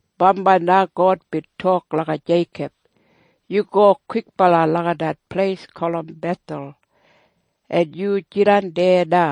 Bambai na God bin tok langa Jeikob, “Yu go kwikbala langa det pleis gulum Bethel, en yu jidan deya na.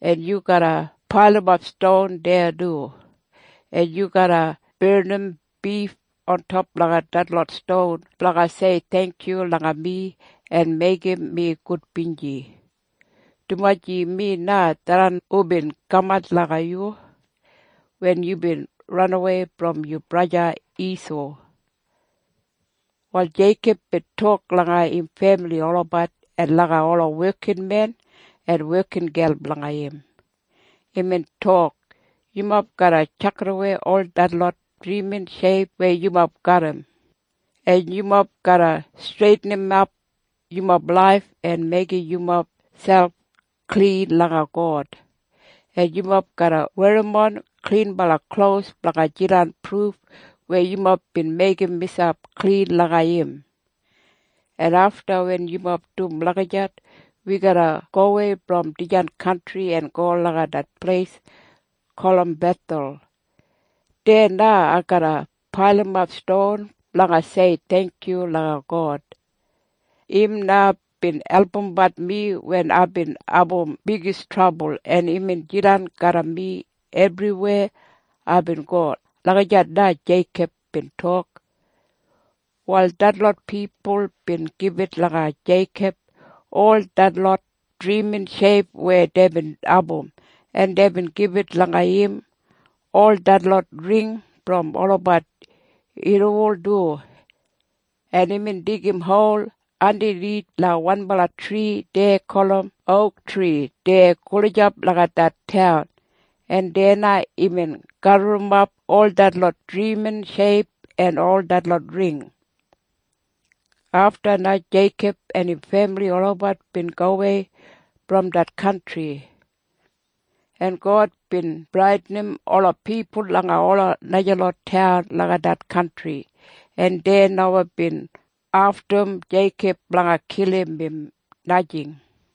En yu garra pailimap ston deya du, en yu garra barnim bif ontop langa detlot ston blanga sei theingkyu langa mi en meigim mi gudbinji, dumaji mi na tharran hubin kamat langa yu wen yubin ranawei brom yu braja Isau.” Wal Jeikob bin tok langa im femili olabat en langa ola wekinmen en wekingel blanga im. Imbin tok, “Yumob garra tjakidawei ol detlot drimin sheip weya yumob garram, en yumob garra streitinimat yumob laif en meigim yumob selp klin langa God, en yumob garra werrimon klinbala klos blanga jidan pruf weya yumob bin meigim miselp klin langa im. En afta wen yumob dum lagijat, wi garra gowei brom dijan kantri en go langa det pleis gulum Bethel. Deya na ai garra pailimap ston blanga sei theingkyu langa God. Im na bin albumbat mi wen aibin abum bigis trabul, en imbin jidan garram mi ebriweya aibin go.” Lagijat na Jeikob bin tok. Wal detlot pipul bin gibit langa Jeikob ol detlot drimin sheip weya deibin abum, en deibin gibit langa im ol detlot ring brom olabat irriwol du, en imbin digim hol andanith langa wanbala tri dei gulum ouktri deya gulijap langa det taun, en deya na imbin gaburrumap ol detlot drimin sheip en ol detlot ring. Afta na Jeikob en im femili olabat bin gowei brom det kantri, en God bin bradinim ola pipul langa ola najalot taun langa det kantri, en dei nomo bin aftum Jeikob blanga kilim im, najing.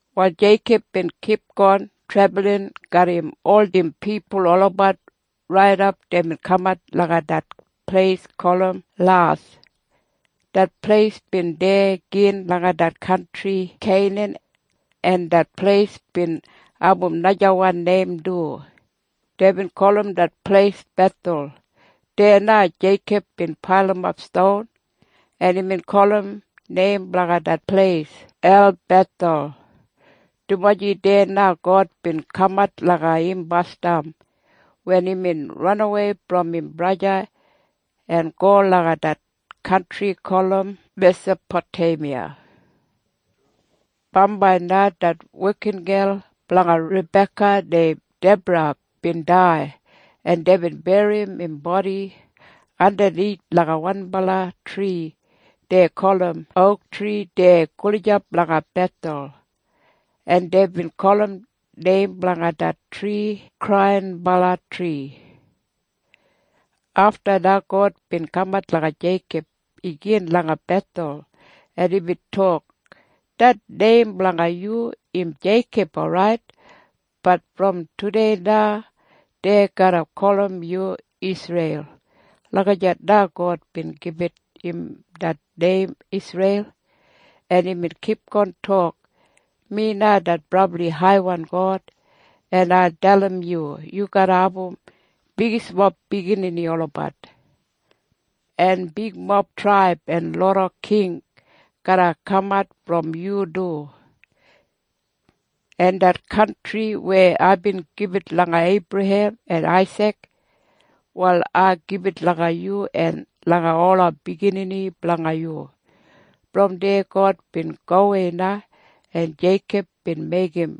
Wal Jeikob bin kipgon trebulin garram ol im pipul olabat raidap deibin kamat langa det pleis gulum Las. Det pleis bin deya gin langa det kantri Keinan. En det pleis bin abum najawan neim du. Deibin gulum det pleis Bethel. Deya na Jeikob bin pailimap ston, en imbin gulum neim blanga det pleis Elbethel, dumaji deya na God bin kamat langa im basdam wen imbin ranawei brom im braja en go langa det kantri gulum Mesapoteimiya. Bambai na det wekingel blanga Rabeka neim Debra bin dai, en deibin berrim im bodi andanith langa wanbala tri dei gulum ouktri deya gulijap langa Bethel, en deibin gulum neim blanga det tri Kraiyinbala Tri. Afta na God bin kamat langa Jeikob igin langa Bethel, en imbin tok, “Det neim blanga yu im Jeikob orait. Bat brom tudei na dei garra gulum yu Isreil.” Lagijat na God bin gibit im det neim Isreil. En imbin kipgon tok, “Mi na det brabli haiwan God. En ai dalim yu. Yu garra abum bigismob biginini olabat, en bigmob traib en loda king garra kamat brom yu du. En det kantri weya aibin gibit langa Eibrahem en Aisik, wal ai gibit langa yu en langa ola biginini blanga yu.” Brom deya God bin gowei na, en Jeikob bin meigim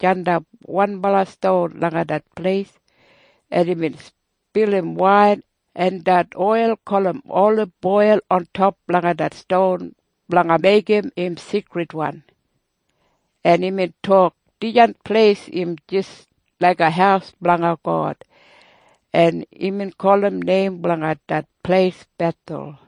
jandap wanbala ston langa det pleis, en imbin spilim wain en det oil gulum oliboil ontop langa det ston blanga meigim im seikridwan, en imbin tok, “Dijan pleis im jis laiga haus blanga God.” En imbin gulum neim blanga det pleis Bethel.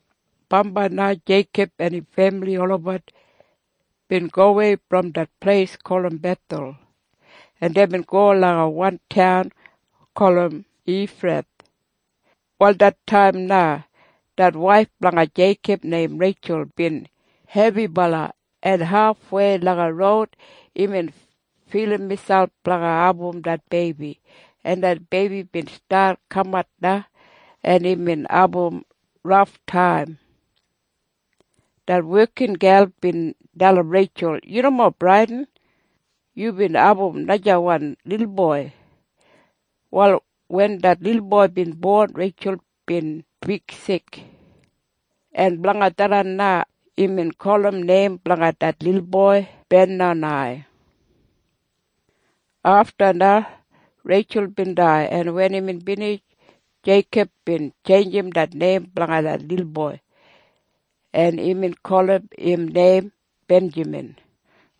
Bambai na Jeikob en im femili olabat bin gowei brom det pleis gulum Bethel, en deibin go langa wan taun gulum Efrath. Wal det taim na det waif blanga Jeikob neim Reitjul bin hebibala, en hafwei langa roud imbin filim miselp blanga abum det beibi, en det beibi bin stat kamat na, en imbin abum raftaim. Det wekingel bin dalim Reitjul, “Yu nomo bradin. Yubin abum najawan lilboi.” Wal wen det lilboi bin bon, Reitjul bin bigsik. En blanga tharran na imbin gulum neim blanga det lilboi Benonai. Afta na Reitjul bin dai, en wen imbin binij, Jeikob bin tjeinjim det neim blanga det lilboi, en imbin gulum im neim Benjamin.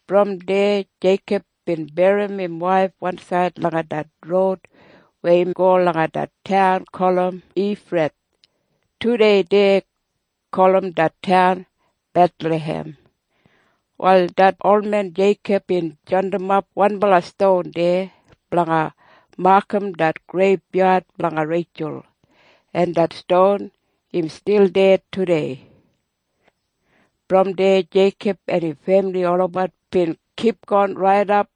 Brom deya Jeikob bin berrim im waif wansaid langa det roud weya im go langa det taun gulum Efrath. Tudei dei gulum det taun Bethlahem. Wal det olmen Jeikob bin jandimap wanbala ston deya blanga makam det greibyad blanga Reitjul. En det ston im stil deya tudei. Brom deya Jeikob en im femili olabat bin kipgon raidap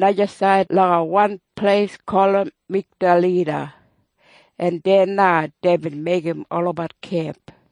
najasaid langa wan pleis gulum Migdalida, en deya na deibin meigim olabat kemp.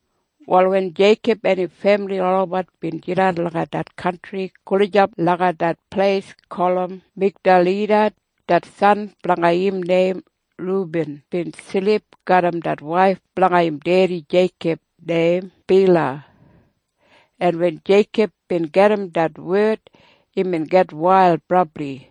Wal wen Jeikob en im femili olabat bin jidan langa det kantri gulijap langa det pleis gulum Migdalida, det san blanga im neim Rubin bin silip garram det waif blanga im dedi Jeikob neim Bila. En wen Jeikob bin gedim det wed, imbin gitwail brabli.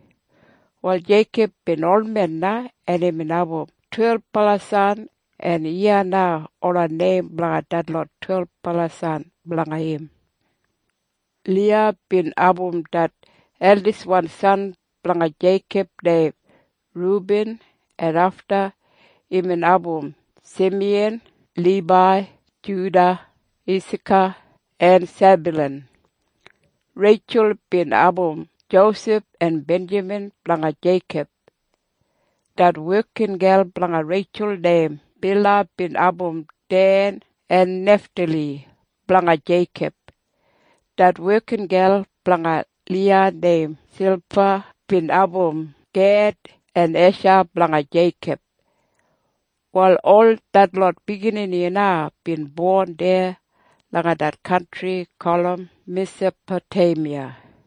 Wal Jeikob bin olmen na, en imbin abum twelbala san. En iya na ola neim blanga detlot twelbala san blanga im. Liya bin abum det eldiswan san blanga Jeikob neim Rubin, en afta imbin abum Simiyan, Libai, Juda, Isaka en Sebyulan. Reitjul bin abum Josef en Benjamin blanga Jeikob. Det wekingel blanga Reitjul neim Bila bin abum Den en Neftali blanga Jeikob. Det wekingel blanga Liya neim Silpa bin abum Ged en Esha blanga Jeikob. Wal ol detlot biginini na bin bon deya langa det kantri gulum Mesapoteimiya.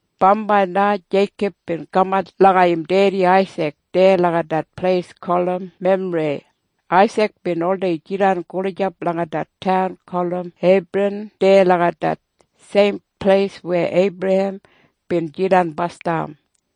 Bambai na Jeikob bin kamat langa im dedi Aisik deya langa det pleis gulum Memrei. Aisik bin oldei jidan gulijap langa det taun gulum Hebran deya langa det seim pleis weya Eibrahem bin jidan basdam.